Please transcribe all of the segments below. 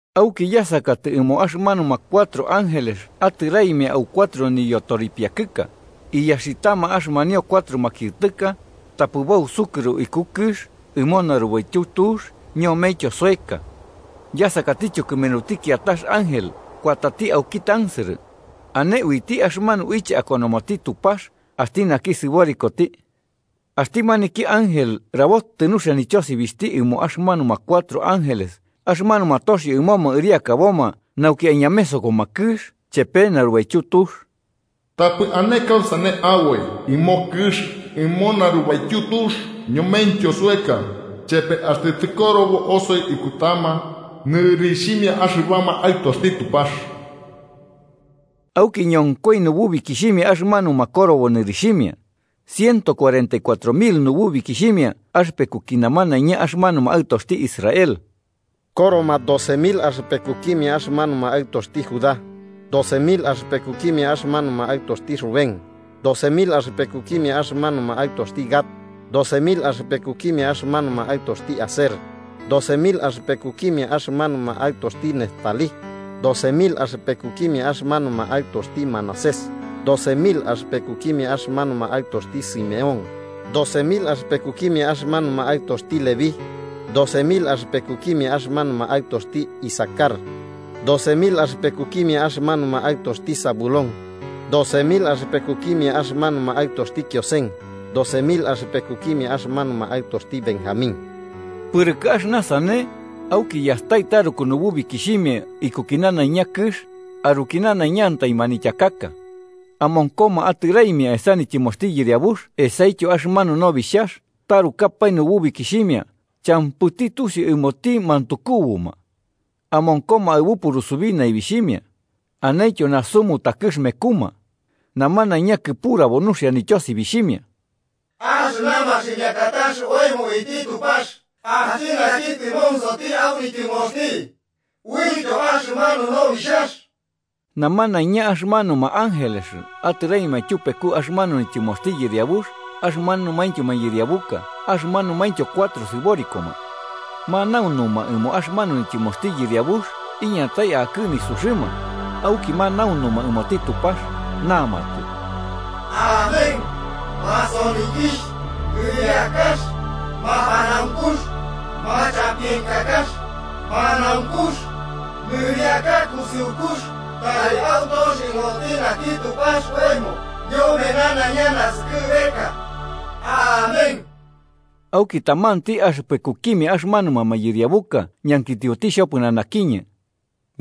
Auki, yasakatɨ ɨmo axɨmanuma cuatro ángeles atɨraimia au cuatro nityoripiakɨka, iyaxitama axɨmanio cuatro makiɨtɨka, tapɨ bausukɨro iku kɨx ɨmo narubaityu tux ñomentyo soeka. Yasakatityo kɨmenuti kiatax ángel kuatati auki tansɨrɨ, ane uiti axɨmanu uiche akonomoti Tupax axti naki sɨborikoti. Axti maniki ángel rabotɨ nuxia nityosibixhti ɨmo axɨmanuma cuatro ángeles axɨmanuma toxio ɨmoma ɨriakaboma nauki aiñamesokoma kɨx chepe narubaityu tux: “¡Tapɨ ane kausane aboi ɨmo kɨx ɨmo narubaityu tux ñomentyo soeka, chepe axtɨ tɨkorobo osoi ikutama nɨrixhimia axɨbama aɨtoxti Tupax!” Auki ñonkoi nububikixhimia axɨmanuma korobo nɨrixhimia: ciento cuarenta y cuatro mil nububikixhimia axɨpekuki namanaiña axɨmanuma aɨtoxti Israel. Koroma doce mil axɨpekukimia axɨmanuma aɨtoxti Judá, doce mil axɨpekukimia axɨmanuma aɨtoxti Rubén, doce mil axɨpekukimia axɨmanuma aɨtoxti Gad, doce mil axɨpekukimia axɨmanuma aɨtoxti Aser, doce mil axɨpekukimia axɨmanuma aɨtoxti Neftalí, doce mil axɨpekukimia axɨmanuma aɨtoxti Manasés, doce mil axɨpekukimia axɨmanuma aɨtoxti Simeón, doce mil axɨpekukimia axɨmanuma aɨtoxti Leví, doce mil axɨpekukimia axɨmanuma aɨtoxti Isacar, doce mil axɨpekukimia axɨmanuma aɨtoxti Zabulón, doce mil axɨpekukimia axɨmanuma aɨtoxti Kiosen, doce mil axɨpekukimia axɨmanuma aɨtoxti Benjamín. Pɨrɨkɨ axɨna sane, auki yastai taruku nububikixhimia ikuki nanaiña kɨx, aruki nanaiñantai manityakaka. Amonkoma atɨraimia esa nityɨmoxti yɨriabux esaityo axɨmanu Nobixhax, tarukapae nububikixhimia champɨti tusiu ɨmoti mantukubuma. Amonkoma aɨbu purusubi naibixhimia. Anentyo nasu mutakɨx mekuma. Namanaiña kɨpurabo nuxia nityosibixhimia: “¡Axɨna maximiakatax oemo uiti Tupax axti naki tɨmonsoti au nityɨmoxti, uityo axɨmanu Nobixhax!” Namanaiña axɨmanuma ángeles atɨraimia tyupeku axɨmanu nityɨmoxti yɨriabux axɨmanumaintyo mayɨriabuka axɨmanumaintyo cuatro sɨborikoma. Manaunuma ɨmo axɨmanu nityɨmoxti Yɨriabux iñatai akɨ nisuxɨma, auki manaunuma ɨmoti Tupax namatɨ: “¡Amén! Masonikixh, nɨriakax, mapanaunkux, machampienkakax, manaunkux, nɨriakax kusɨukux tari autoxi ɨmoti naki Tupax oemo ñome nanaiña naskɨbeka. ¡Amén!” Auki tamanti axɨpekukimia axɨmanuma mayɨriabuka ñankitioti xhopɨnanakiñɨ: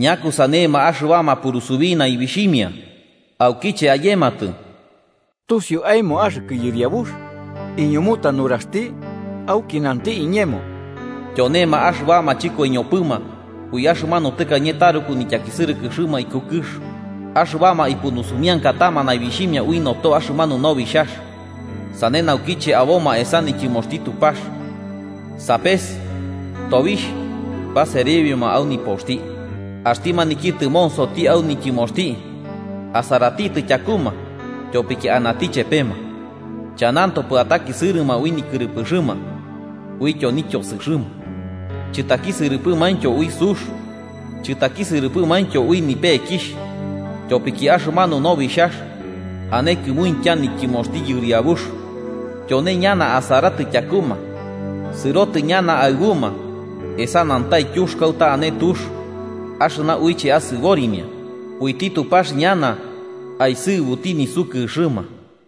“¿Ñakusanema axɨbama purusubi naibixhimia, aukiche ayematɨ?” “Tusiu aemo axɨkɨ yɨriabux”, iñumuta nuraxti. Auki nanti iñemo: “Tyonema axɨbama chɨkoiñopɨma ui axɨmanu tɨkañe taruku nityakisɨrɨkɨxɨma iku kɨx, axɨbama ipunusumiankatama naibixhimia ui noto axɨmanu Nobixhax. “Sane naukiche aboma esa nityɨmoxti Tupax, sapes tobixh baserebioma au nipoxti. Axti maniki tɨmonsoti au nityɨmoxti asaratitɨ tyakuma tyopiki anati chepema. Chanantopɨ atakisɨrɨma ui nikɨrɨpɨxɨma uityo nityosɨxɨma, chɨtakisɨrɨpɨmaintyo ui sux, chɨtakisɨrɨpɨmaintyo ui nipekixh. Tyopiki axɨmanu Nobixhax, ane kɨmuintya nityɨmoxti Yɨriabux, tyone ñana asaratɨ tyakuma sɨrotɨ ñana aɨbuma esa nantaityux kauta ane tux axɨna uiche asɨborimia, uiti Tupax ñana aisɨbuti nisukɨxɨma.”